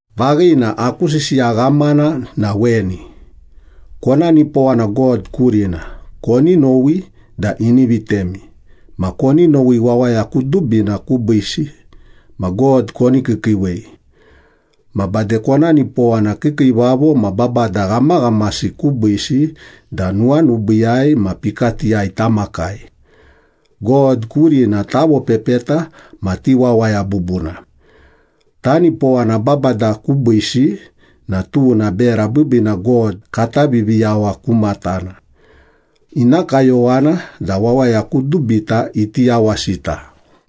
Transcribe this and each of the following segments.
Vaghina, aku sisiya ghamana na weni. Kona nipowana God kurina, koni nowi da ini vitemi, ma koni nowi wawaya kudubina kubiisi, ma God koni kiikiiwei. Ma bade kona nipowana kiikiivavo ma babada ghamaghamasi kubiisi da nuwanubiiyai ma pikatiyai tamakai. God kurina tavopepeta ma ti wawaya bubuna. Tanipowana babada kubiisi na tuna bera biibiina God kata Viviyawa ku matana. Ina kayowana da wawaya kudubita iti yawasita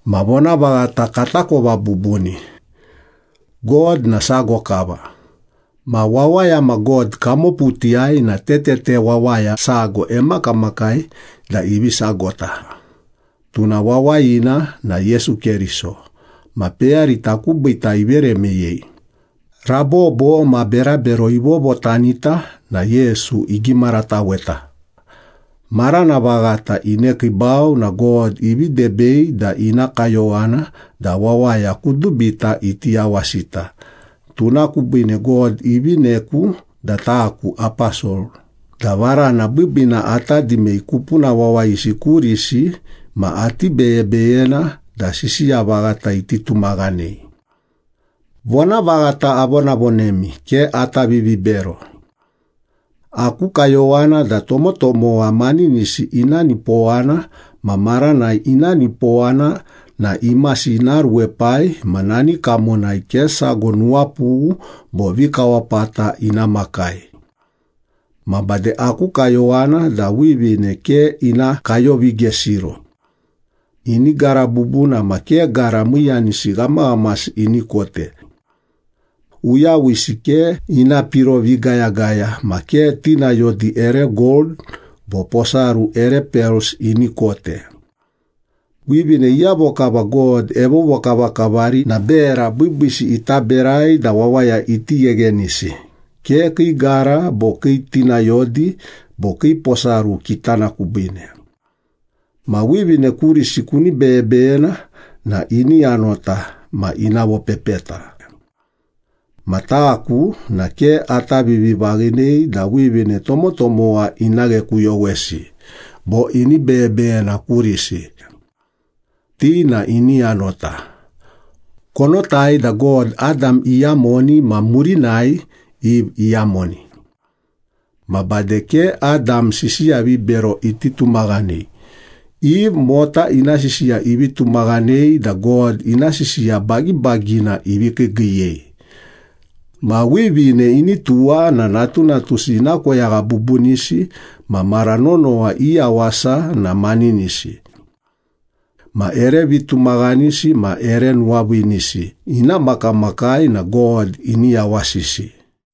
ma vonavaghata katakova bubuni. God na sago kava. Ma wawaya ma God kamoputiyai na tetete wawaya sago emakamakai da ivi sagota. Tuna wawayina na Yesu Keriso, ma peyarita kubiita ivere meyei. Rabobo ma berabero ivovotanita na Yesu igimarataweta. Marana vaghata inekiibau na God ivi debei da ina kayowana da wawaya kudubita iti yawasita. Tuna kubiine God ivineku da taku aposol, da varana biibiina ata dimei kupuna wawayisi kurisi ma ati beyebeyena da sisiya vaghata iti tumaghanei. Vonavaghata avonavonemi, ke ata vivibero. Aku kayowana da tomotomowa maninisi ina nipowana, ma maranai ina nipowana na imasi ina ruepai ma nani kamonai ke sago nuwapughu bo vikawapata ina makai. Ma bade aku kayowana da wivine ke ina kayovigesiro. Ini gara bubuna ma ke gara miiyanisi ghamaghamasi ini kote. Uyawisi ke ina piro vigayagaya ma ke tinayodi ere gold bo posaru ere pels ini kote. Wivine iyavo kava God evovokavakavari na bera biibiisi ita berai da wawaya iti gheghenisi, ke kii gara bo kii tinayodi bo kii posaru kitana kubiine. Ma wivine kurisi kuni beyebeyena na ini yanota ma ina vopepeta. Ma taku na ke ata vivivaghinei da wivine tomotomowa ina ghekuyowesi bo ini beyebeyena kurisi. Ti na ini yanota. Konotai da God, Adam iyamoni ma murinai Eve iyamoni. Ma bade ke Adam sisiya vibero iti tumaghanei, Eve mota ina sisiya ivi tumaghanei da God ina sisiya bagibagina ivi kiigiiyei. Ma wivine ini tuwa na natunatusi ina koyagha bubunisi ma mara nonowa i yawasa na maninisi. Ma ere vitumaghanisi ma ere nuwaviinisi ina makamakai na God ini yawasisi.